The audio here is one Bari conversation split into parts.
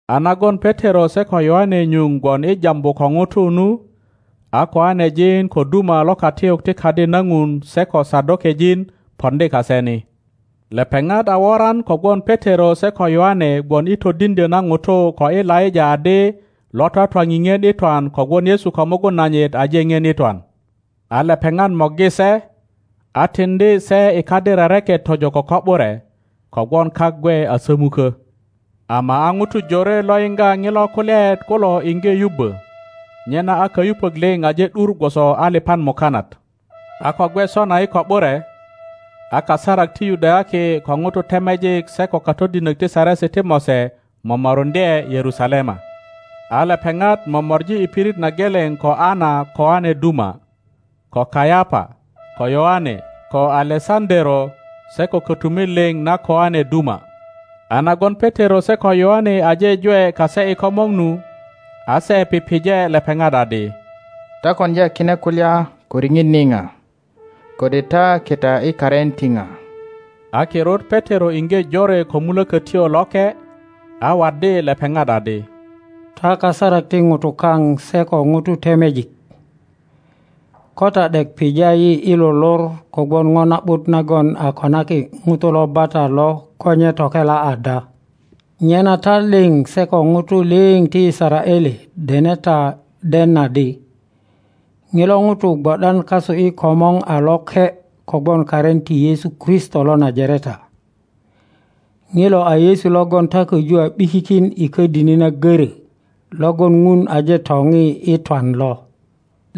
A nagon Petero se ko Yoane nyuŋ gwon i jambu ko ŋutu nu, a koanejin ko duma lo katiyuk ti Kadi na Ŋun se ko Sadokejin poŋdi kase ni. Lepeŋat a woran kogwon Petero se ko Yoane gwon i todiŋdyö na ŋutu ko i laŋa adi lo twatwa pipien i twan kogwon Yesu ko mugun nanyit aje ŋien i twan. A lepeŋat morgi se, a tiŋdi se i kadi rereket tojo ko ko ’bure, kogwon kak gwe a somukö. Ama a ŋutu jore lo yiŋga ŋilo kulyaet kulo iŋge yubbö; nyena a kayupök liŋ aje ’dur gwoso aliŋan mukanat. A ko gwe sona i ko ’bure, a kasarak ti Yudayaki ko ŋutu temejik se ko katodinok ti Saresi ti Mose momoruŋdye Yerusalema. A lepeŋat momori i pirit na geleŋ ko Ana koane duma, ko Kayapa, ko Yoane, ko Alesaŋöero se ko kötumit liŋ na koane duma. A nagon Petero se ko Yoane aje jwe kase i komor nu, a se pije lepeŋat adi, Ta koŋdya kine kulya ko riŋit nipa, kode ta kita i karin ti pa? A kirut Petero iŋge jore ko Mulökötyo Loke, a waddi lepeŋat adi, Ta kasarak ti ŋutu kaŋ se ko ŋutu temejik, ko ta ’dek pija yi i lo lor kogwon po na ’but nagon a konaki ŋuto lo bata lo ko nye tokela ada, nyena ta liŋ se ko ŋutu liŋ ti Yisaraele dene ta den adi, ŋilo ŋuto gwo ’dan kasu i komor a loke kogwon karin ti Yesu Kristo lo Najareta. Ŋilo a Yesu logon ta köju a ’bikikin i ködini na görö logon Ŋun aje topi i twan lo.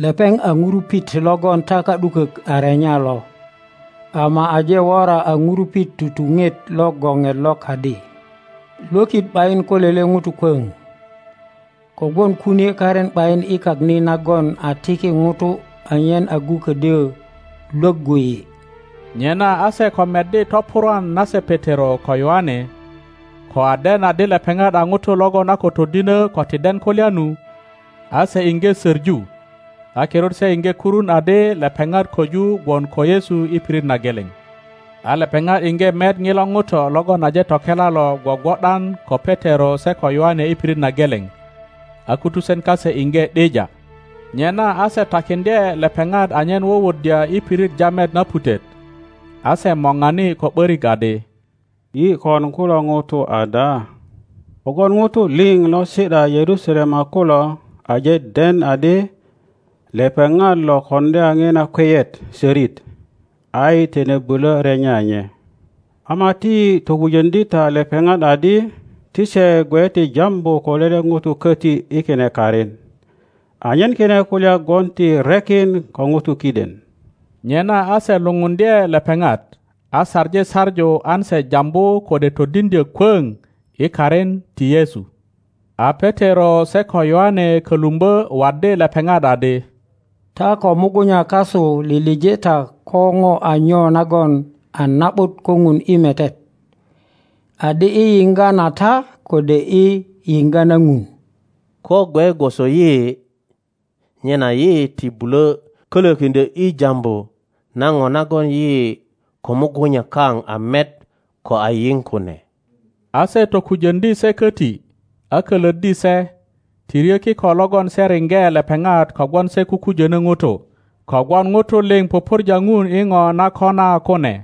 Lepeŋ a ŋurupit logon ta ka ’dukök a renya lo, ama aje wora a ŋurupit tutuŋet lo goŋet lo kadi. Lwökit ’bayin ko lele ŋuto kwöŋ, kogwon kunie karin ’bayin i kak ni nagon a tiki ŋutu anyen agu ködyö lwöggu yi. Nyena a se ko meddi topurwan nase Petero ko Yoane, ko a den adi lepeŋat a ŋutu logon a ko todinö ko ti den kulya nu, a se iŋge söŋu; a kirut se iŋge kurun adi lepeŋat köju gwon ko Yesu i pirit na geleŋ. A lepeŋat iŋge met ŋilo ŋuto logon aje tokela lo gwogwo ’dan ko Petero se ko Yoane i pirit na geleŋ, a kutusen kase iŋge ’dija. Nyena a se takiŋdye lepeŋat anyen wuwuddya i pirit jamet na putet, a se morani ko ’börik adi, Yi kon kulo ŋutu ada? Kogwon ŋutu liŋ lo si ’da Yerusalema kulo aje den adi lepeŋat lo koŋdya ŋina kweyet sörit, a yi tine bulö renya nye. Ama ti yi tokujöŋdi ta lepeŋat adi ti se. gwe ti jambu ko lele ŋuto köti i kine karin, anyen kine kulya gwon ti rekin ko ŋutu kiden. Nyena a se lupundye lepeŋat, a saŋi saŋu an se jambu kode todiŋdyö kwoŋ i karin ti Yesu. A Petero se ko Yoane kölumbö waddi lepeŋat adi, Ta ko mugunya kasu lilije ta ko po a nyo nagon a na ’but ko Ŋun i metet: adi i yiŋga na ta kode i yiŋga na Ŋun? Ko gwe gwoso yi, nyena yi ti bulö kölökiŋdyö i jambu na po nagon yi ko mugunya kaŋa met ko a yiŋ kune. A se tokujoŋdi se köti, a kölöddi se, ti ryö kiko logon se riŋge lepeŋat kogwon se kukujönö ŋutu; kogwon ŋutu liŋ pupurja Ŋun i po na kona kune.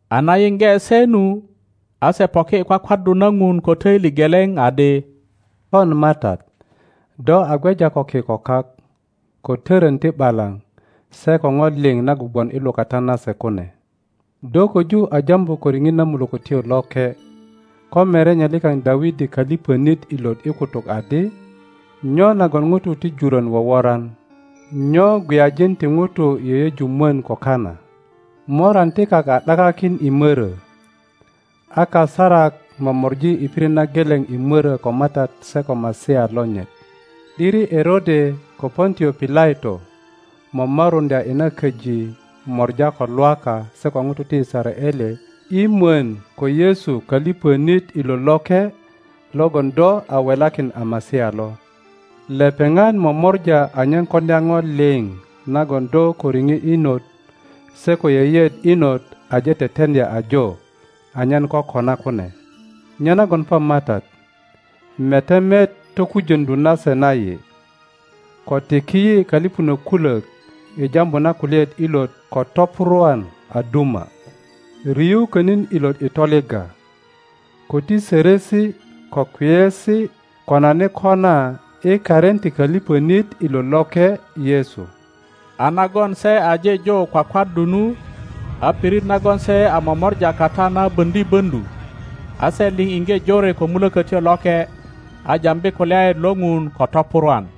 A na yiŋge se nu, a se poki i kwakwaddu na Ŋun ko töili geleŋ adi, Pon Matat, do a gweja ko ki ko kak, ko toron ti ’balaŋ se ko po liŋ nagon gwon i lukata nase kune. Do köju a jambu ko riŋit na Mulökötyo Loke ko merenye likaŋ Dawidi koliŋonit ilot i kutuk adi, Nyo nagon ŋutu ti jurön woworan? Nyo iŋweyajin ti ŋutu yeyeju mwon ko kana? Moran ti kak a ’dakakin i mörö, a kasarak momori i pirit na geleŋ i mörö ko Matat se ko Masia lonyit. ’Diri Erode ko Pontio Pilato momoruŋdya i na köji mora ko Lwaka se ko ŋutu ti Yisaraele i mwon ko Yesu köliŋonit ilot loke, logon do a welakin a Masia lo. Lepeŋat momora anyen koŋdya po liŋ nagon do ko riŋit inot se ko yeyeet inot aje teteŋdya ajo anyen kokona kune. Nyenagon pon Matat, mete met tokujöŋdu nase na yi, ko tiki yi köliŋönök kulök i jambu na kulyaet ilot ko topurwan a duma. Riu könin ilot i toligga, ko ti sörösi ko kweyesi konani kona i karin ti köliŋonit ilot loke Yesu. A nagon se aje jo kwakwaddu nu, a pirit nagon se a momora kata na boŋdi böŋdu, a se liŋ iŋge jore ko Mulökötyo Loke, a jambi kulyaet lo Ŋun ko topurwan.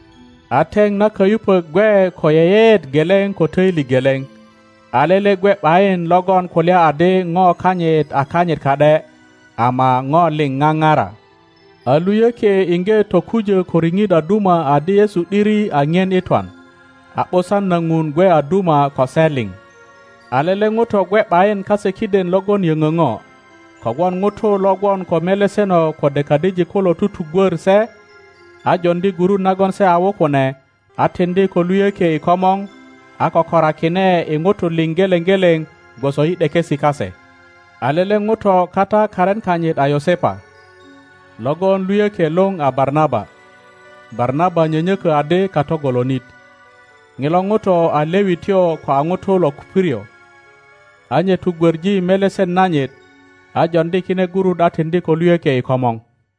A teŋ na kayupök gwe ko yeyeet geleŋ ko töili geleŋ, a lele gwe ’bayin logon kulya adi po kanyit a kanyit ka ’de, ama po liŋ papara. a luyökie iŋge tokujö ko riŋit a duma adi Yesu ’diri a ŋien i twan, a ’busan na Ŋun gwe a duma ko se liŋ. a lele ŋuto gwe ’bayin kase kiden logon yöŋö ŋo, kogwon ŋutu lo gwon ko meleseno kode kadijik kulo tutugwör se, a joŋdi gurut nagon se a wu kune a tiŋdi ko luyökie i komor, a kokorakine i ŋutu liŋ geleŋ geleŋ gwoso i ’dekesi kase. A lele ŋuto kata karin kanyit a Yosepa, logon luyökie luŋ a Barnaba. (Barnaba nyönyökö adi kato golonit.) Ŋilo ŋuto a Lewityo ko a ŋuto lo Kuprio. A nye tugwöŋi melesen nanyit, a joŋdi kine gurut a tiŋdi ko luyökie i komor.